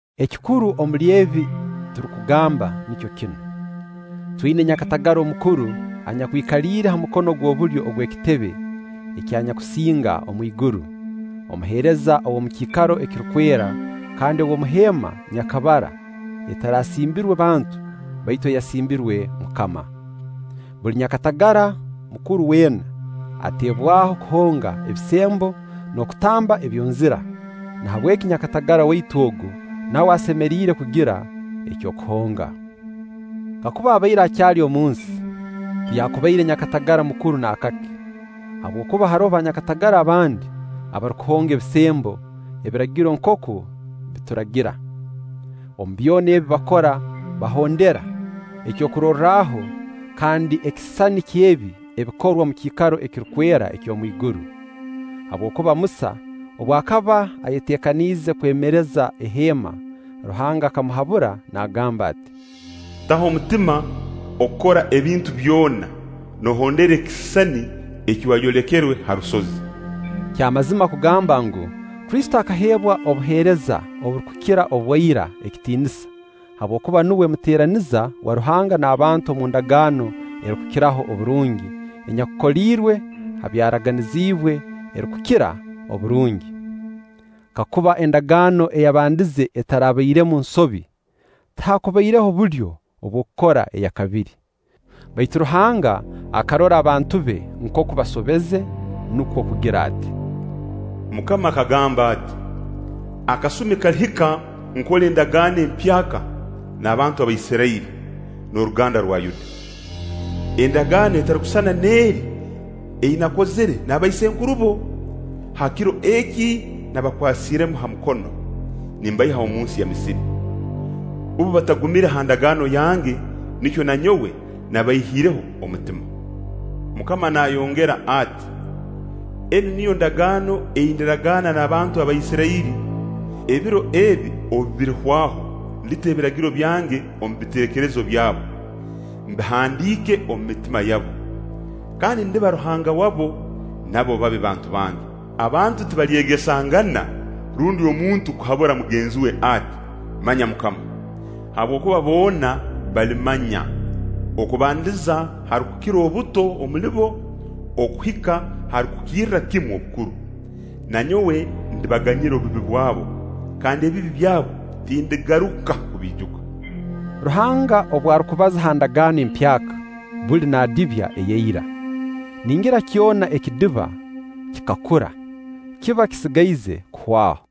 Ekikuru omuli ebi turukugamba nikyo kinu: Twina nyakatagara omukuru anyakwikaliire ha mukono ogw'obulyo ogw'Ekitebe ky'Anyakusinga omwiguru, omuheereza ow'omu kiikaro ekirukwera kandi ow'omu heema nyakabara etarasimbirwe bantu, baitu eyasimbirwe MUKAMA. Buli nyakatagara mukuru weena ateebwaho kuhonga ebisembo n'okutamba ebyonzira; nahabweki nyakatagara waitu ogu nawe asemeriire kugira eky'okuhonga. Kakuba abaire akyali omu nsi, tiyaakubaire nyakatagara mukuru naakake, habwokuba haroho banyakatagara abandi abarukuhonga ebisembo Ebiragiro nkooku bituragira. Omu byona ebi bakora bahondera ekyokurorraho kandi ekisisani ky'ebi ebikorwa omu kiikaro ekirukwera eky'omwiguru. Habwokuba Musa, obu akaba ayeteekanize kwemereza eheema, Ruhanga akamuhabura naagamba ati: “Taho omutima okukora ebintu byona noohondera ekisisani eki wayolekerwe ha rusozi.” Kya mazima kugamba ngu, Kristo akaheebwa obuheereza oburukukira obwa ira ekitiinisa, habwokuba nuwe muteeraniza wa Ruhanga n'abantu omu ndagaano erukukiraho oburungi, enyakukoliirwe ha byaraganiziibwe ekirukukira oburungi. Kakuba endagaano eyabandize etarabairemu nsobi, tihaakubaireho bulyo obw'okukora eya kabiri. Baitu Ruhanga akarora abantu be nkooku basobeze, nukwo kugira ati: “MUKAMA akagamba ati: ‘Akasumi kalihika nkole endagaano empyaka na bantu ba Israiri n'oruganda rwa Yuda. Endagaano etarukusisana n'eri ei nakozire n'abaisenkurubo ha kiro eki nabakwasire ha mukono nimbaiha omunsi ya Misiri. Bbo batagumire ha ndagaano yange, nikyo na nyowe nabaihiireho omutima.’ MUKAMA naayongera ati: Enu niyo ndagaano ei ndiragaana n'abantu ba Isirairi: ebiro ebi obu birihwaho ndita ebiragiro byange omu biteekerezo byabo, mbihandiike omu mitima yabo; kandi ndiba Ruhanga wabo, nabo babe bantu bange. Abantu tibalyegesangana rundi omuntu kuhabura mugenzi we ati: ‘Manya MUKAMA’. Habwokuba boona balimmanya, okubandiza h'arukukira obuto omuli bo okuhika h'arukukirra kimu obukuru. Na nyowe ndibaganyira obubi bwabo, kandi ebibi byabu tindigaruka kubiijuka.” Ruhanga obu arukubaza ha ndagaano empyaka, buli naadibya eya ira. Ningira kyona ekidiba kikakura, kiba kisigaize kuhwaho.